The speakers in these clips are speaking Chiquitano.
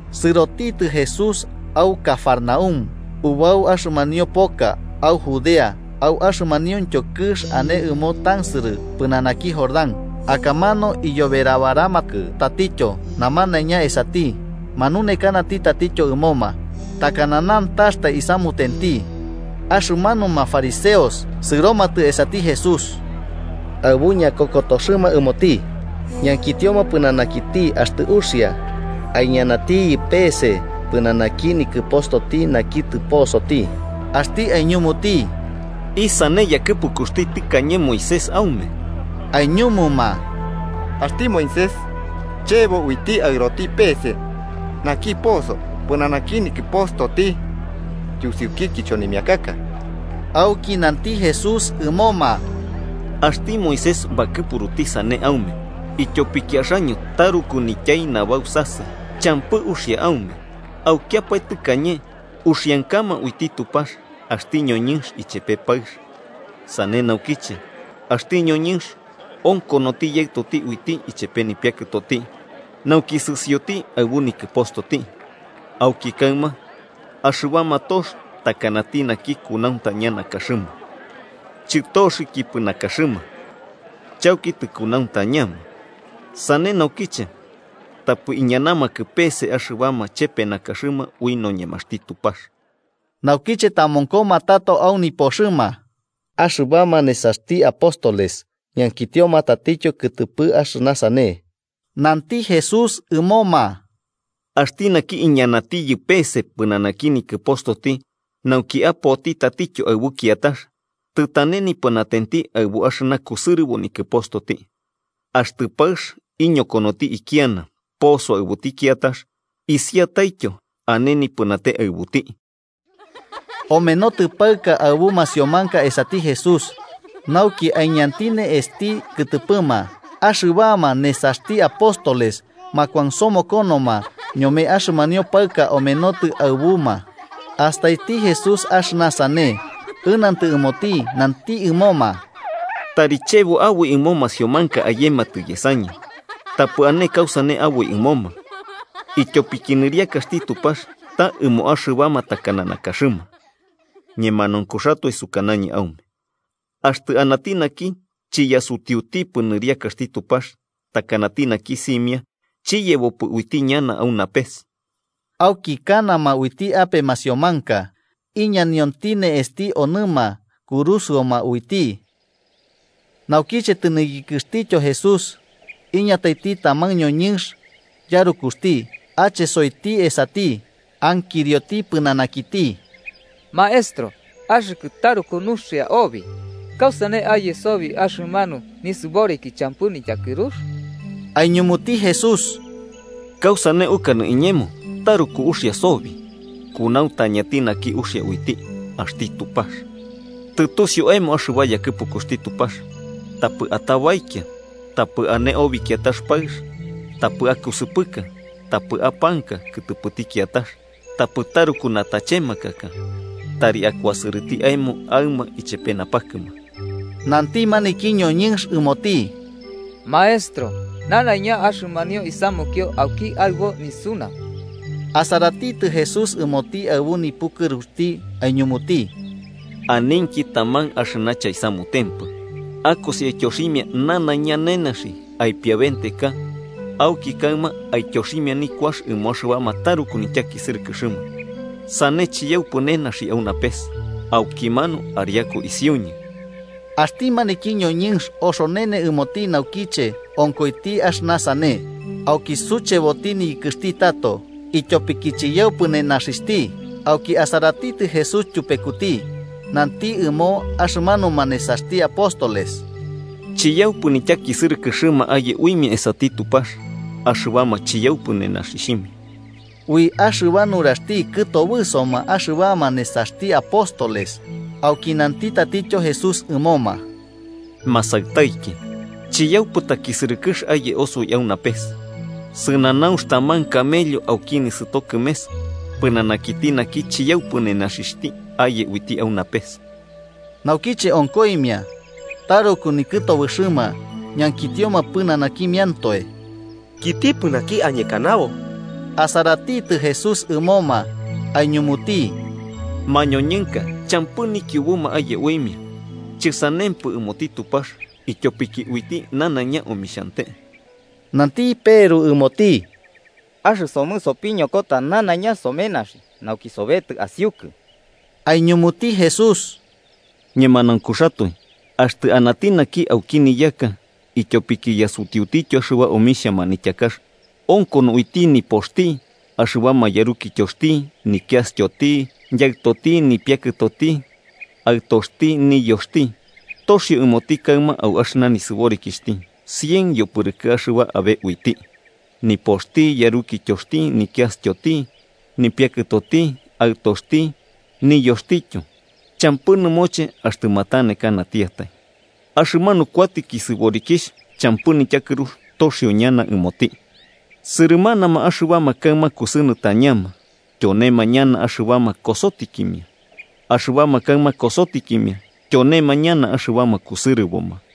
Sɨrotitɨ Jesús au Cafarnaúm ubau axɨmanio poka au Judea au axɨmanuintyo kɨx ane ɨmo tansɨrɨ pɨnanaki Jordán. Akamanu iyoberabaramakɨ tatityo namanaiña esati, manunekanati tatityo ɨmoma, takana nantaxtai isamutenti. Axɨmanuma fariseos sɨromatɨ esati Jesús, aɨbu ñakokotoxɨma ɨmoti, ñankitioma pɨnanakiti axtɨ uxia aiñanatiyɨ peese pɨnanaki nikɨpostoti naki tɨposoti. Axti aiñumuti: –¿Isane yakɨpukuxti tɨkañe Moisés aume? Aiñumuma: –Axti Moisés chebo uiti aɨroti pe'ese naki poso pɨnanaki nikɨpostoti yusiuki kichonimiakaka. Auki nanti Jesús ɨmoma: –Axti Moisés bakɨpuruti sane aume, ityopiki axaño taruku nityai nabausasɨ champɨ uxia aume. Aukiapae tɨkañe, ‘uxiankama uiti Tupax, axti ñoñɨnx ichepe paɨx. Sane naukiche axti ñoñɨnx onkonoti yaɨtoti uiti ichepe nipiakɨtoti, nauki sɨsioti aɨbu nikɨpostoti, auki kaɨma axɨbama tox takanati naki kunauntaña nakaxɨma.’ Chɨtoxɨkipɨ nakaxɨma, chauki tɨkunauntañama. Sane naukiche tapɨ iñanamakɨ pe'ese axɨbama chepe nakaxɨma ui noñemaxti Tupax. Naukiche tamonkoma tato au nipoxɨma, axɨbama nesaxti apóstoles ñankitioma tatityo kɨtɨpɨ axɨna sane. Nanti Jesús ɨmoma: –Axti naki iñanatiyɨ peese pɨnanaki nikɨpostoti nauki apoti tatityo aɨbu kiatax, tɨtane nipɨnatenti aɨbu axɨna kusɨrɨbo nikɨpostoti. Axtɨ paɨx iñokonoti ikiana poso aɨbuti kiatax, isiataityo ane nipɨnate aɨbuti. Omenotɨ paɨka aɨbu masiomanka esati Jesús, nauki aiñanti ne'esti kɨtɨpɨma. Axɨbama nesaxti apóstoles makuansomokonoma ñome axɨmanio paɨka omenotɨ aɨbuma. Astaiti Jesús axɨna sane, ɨnantɨ ɨmoti nanti ɨmoma: –Tari chebo aboi ɨmo masiomanka ayematɨ yesañɨ, tapɨ ane kausane aboi ɨmoma, ityopiki nɨriakaxti Tupax ta ɨmo axɨbama takana nakaxɨma. Ñemanaunkuxatoe sukanañɨ aume axtɨ anati naki chiyasutiutipɨ nɨriakaxti Tupax takanati naki simia, chiyebopɨ uiti ñana au napes. Auki kanama uiti ape masiomanka, iñanionti ne'esti onɨma kurusɨoma uiti. Naukiche tɨniyɨkɨxtityo Jesús, iñataiti taman ñoñɨnx yarukuxti, achesoiti esati, ankirioti pɨnanakiti: –Maestro axɨkɨ taruku nuxia obi, ¿kausane aye sobi axɨmanu nisɨboriki champɨ nityakɨrux? Aiñumuti Jesús: –¿Kausane ukanɨ iñemo taruku uxia sobi? Kunauntañati naki uxia uiti: axti Tupax. Tɨtusiu aemo axɨba yakɨpukuxti Tupax: ‘Tapɨ atabaikia, tapɨ ane obi kiatax paɨx, tapɨ akusɨpɨka, tapɨ apanka kɨtɨpɨti kiatax, tapɨ taruku natachemakaka. Tari akuasɨrɨti aemo aɨma ichepe napakɨma.’ Nanti maniki ñoñɨnx ɨmoti: –Maestro, nanaiña axɨmanio isamukio auki aɨbo nisunau. Asaratitɨ Jesús ɨmoti aɨbu nipukɨruxti, aiñumuti: –Aninki taman axɨna chaisamutempɨ: akosi, aityoximia nanaiña nenaxi aipiabenteka auki kaɨma aityoximia nikuax ɨmo axɨbama taruku nityakisɨrɨkɨxɨma. Sane chiyaupɨ nenaxi au napes. Aukimanu ariaku isiuñɨ. Axti maniki ñoñɨnx oxonene ɨmoti naukiche onkoiti axɨna sane. Auki sucheboti niyɨkɨxti tato, ityopiki chiyaupɨ nenaxixhti. Auki asaratitɨ Jesús ityupekuti, nanti ɨmo axɨmanuma nesaxti apóstoles: –¡Chiyaupɨ nityakisɨrɨkɨxɨma aye uimia esati Tupax axɨbama chiyaupɨ nenaxixhimia! Ui axɨba nuraxti kɨtobɨsoma axɨbama nesaxti apóstoles, auki nanti tatityo Jesús ɨmoma: –Masaɨtaiki, ¡chiyaupɨ takisɨrɨkɨx aye osoi au napes! Sɨnanaunx taman camello auki nisɨto kɨmes, pɨnanakiti naki chiyaupɨ nenaxixhti aye uiti au napes. Naukiche onkoimia, taruku nikɨtobɨxɨma, ñankitioma pɨnanakimiantoe: –¿Kitipɨ naki añekanabo? Asaratitɨ Jesús ɨmoma aiñumuti: –Mañoñɨnka champɨ nikiubuma aye uimia, chɨsanempɨ ɨmoti Tupax, ityopiki uiti nanaiña omixhante. Nanti Peru ɨmoti: –Axɨsomɨ sopiñokota nanaiña somenaxi, nauki sobetɨ asiukɨ. Aiñumuti Jesús: –Ñemanaunkuxatoe axtɨ anati naki auki niyaka ityopiki yasutiutityo axɨba omixhia manityakax onkono uiti nipoxti, axɨbama yarukityoxti, nikiastyoti, yaɨtoti, nipiakɨtoti, aɨtoxti, niyoxti, toxio ɨmoti kaɨma au axɨna nisɨborikixhti cien yopɨrɨkɨ axɨba abe uiti, nipoxti, yarukityoxti, nikiastyoti, nipiakɨtoti aɨtoxti niyoxtityo champɨ nɨmoche axtɨ matanekanatiatai. Axɨmanu kuatɨki nisɨborikixhti champɨ nityakɨrux toxio ñana ɨmoti. Sɨrɨmanama axɨbama kaɨma kusɨnɨtañama, tyonema ñana axɨbama kosotikimia. Axɨbama kaɨma kosotikimia, tyonema ñana axɨbama kusɨrɨboma.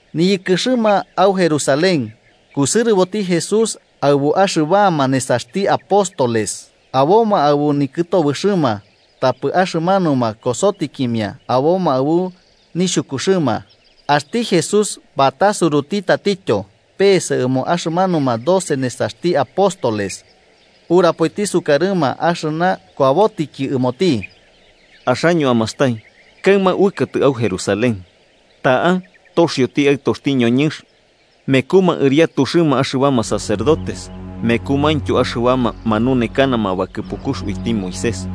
Niyɨkɨxɨma au Jerusalén, kusɨrɨboti Jesús aɨbu axɨbama nesaxti apóstoles. Aboma aɨbu nikɨtobɨxɨma, tapɨ axɨmanuma kosotikimia aboma aɨbu nixhukuxɨma. Axti Jesús batasuruti tatityo peese ɨmo axɨmanuma doce nesaxti apóstoles, urapoiti sukarɨma axɨna kuabotɨki ɨmoti: “Axaño amastai, kaɨma uɨkatɨ au Jerusalén, ta'a toxioti Aɨtoxti noñɨnx mekuma ɨriatuxɨma axɨbama sacerdotes mekumaintyo axɨbama manunekanama bakɨpukux uiti Moisés,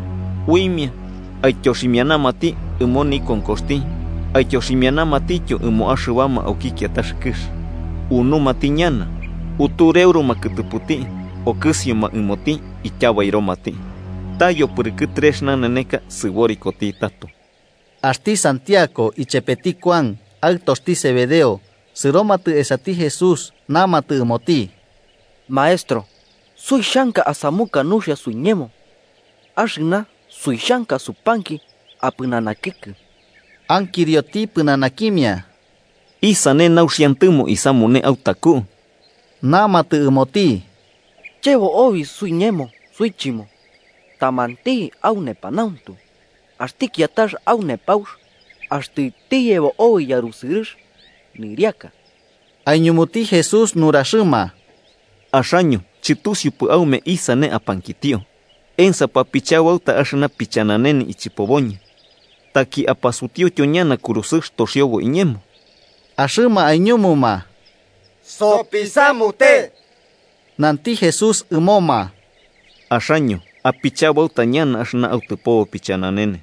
uimia aityoximianamati ɨmo nikonkoxti aityoximianamatityo ɨmo axɨbama auki kiatax kɨx. Unumati ñana, utureuruma kɨtɨpɨti, okɨsioma ɨmoti ityabairomati. Ta yopɨrɨkɨ trex naneneka sɨborikoti tato.” Axti santiago ichepeti Kuan, aɨtoxti Zebedeo, sɨromatɨ esati Jesús namatɨ ɨmoti: –Maestro, suixhanka asamuka nuxia suiñemo axɨna suixhanka supanki apɨnanakikɨ. Ankirioti pɨnanakimia: –¿Isane nauxiantɨmo isamune autaku? Namatɨ ɨmoti: –Chebo obi suiñemo suichɨmo tamanti au nepanauntu axti kiatax au nepaux axtɨ tiyebo obi yarusɨrɨx nɨriaka. Aiñumuti Jesús nuraxɨma: –Axaño chɨtusiupɨ aume isane apankitio. ¿Ensapɨ apichabauta axɨna pichananene ichɨpoboñɨ, taki apasutiutyo ñana kurusɨx toxiobo iñemo? Axɨma aiñumuma: –Sopisamute. Nanti Jesús ɨmoma: –Axaño apichabauta ñana axɨna autɨpobo pichananene,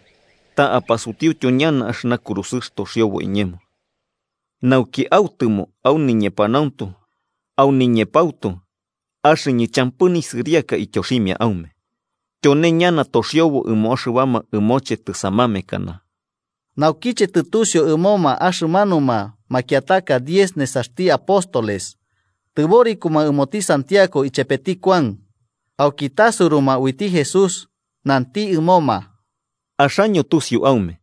ta apasutiutyo ñana axɨna kurusɨx toxiobo iñemo. Nauki autɨmo au niñepanauntu au niñepautu axɨñɨ champɨ nisɨriaka ityoximia aume, tyone ñana toxiobo ɨmo axɨbama ɨmoche tɨsamamekana. Naukiche tɨtusiu ɨmo axɨmanuma makiataka diez nesaxti apóstoles, tɨborikoma ɨmoti Santiago ichepeti Kuan. Auki tasuruma uiti Jesús, nanti ɨmoma: –Axaño tusiu aume,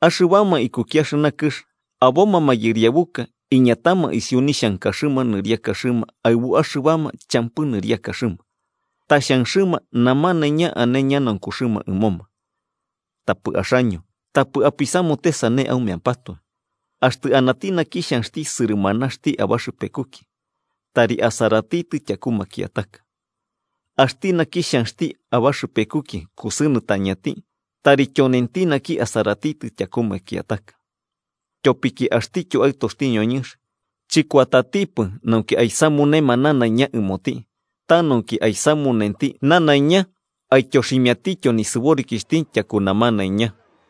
axɨbama ikuki axɨna kɨx aboma mayɨriabuka iñatama isiu nixhankaxɨma nɨriakaxɨma aɨbu axɨbama champɨ nɨriakaxɨma, ta xhanxɨma namanaiña ane ñanaunkuxɨma ɨmoma. Tapɨ axaño tapɨ apisamute sane aumeampatoe. Axtɨ anati naki xhanxti sɨrɨmanaxti abaxɨpekuki, tari asaratitɨ tyaku makiataka, axti naki xhanxti abaxɨpekuki kusɨnɨtañati, tari tyonenti naki asaratitɨ tyaku makiataka. Tyopiki axtityo Aɨtoxti noñɨnx chɨkuatatipɨ nauki aisamunema nanaiña ɨmoti, ta nauki aisamunenti nanaiña aityoximiatityo nisɨborikixhti ityaku namanaiña.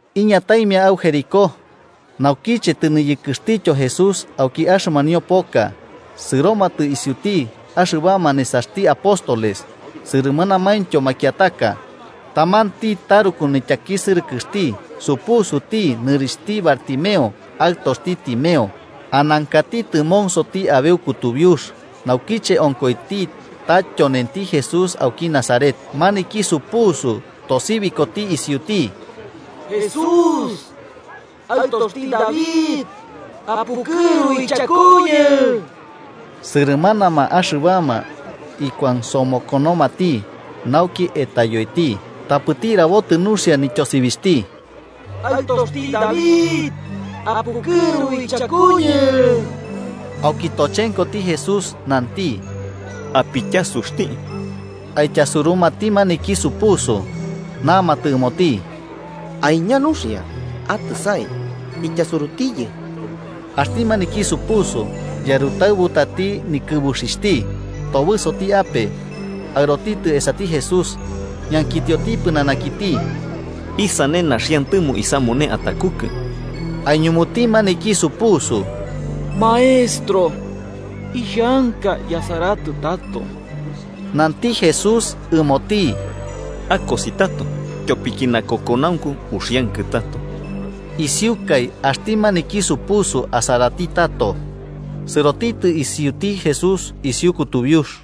Iñataimia au Jericó. Naukiche tɨniyɨkɨxtityo Jesús auki axɨmanio poka, sɨromatɨ isiuti axɨbama nesaxti apóstoles sɨrɨmanamaintyo makiataka, tamanti taruku nityakisɨrɨkɨxti supusuti nɨrixhti Bartimeo, aɨtoxti Timeo, anankati tɨmonsoti abeu kutubiux. Naukiche onkoiti ta tyonenti Jesús auki Nazaret, maniki supusu tosibikoti isiuti: –¡Jesús, Aɨtoxti David, apukɨru ichakuñɨ! Sɨrɨmanama axɨbama ikuansomokonomati nauki etayoiti, tapɨti rabotɨ nuxia nityosibixhti: –¡Aɨtoxti David, apukɨru ichakuñɨ! Auki tochenkoti Jesús, nanti: –Apityasuxti. Aityasurumati maniki supusu, namatɨ ɨmoti. –Aiña nuxia, atɨsai. Ityasurutiyɨ. Axti maniki supusu yarɨtaɨbutati nikɨbuxixhti, tobɨsoti ape aɨrotitɨ esati Jesús, ñankitioti pɨnanakiti: –¿Isane naxiantɨmo isamune atakukɨ? Aiñumuti maniki supusu: –Maestro, ixhanka yasaratɨ tato. Nanti Jesús ɨmoti: –Akosi tato. Tyopiki nakokonaunku uxiankɨ tato. Isiukai axti maniki supusu asaratɨ tato, sɨrotitɨ isiuti Jesús isiu kutubiux.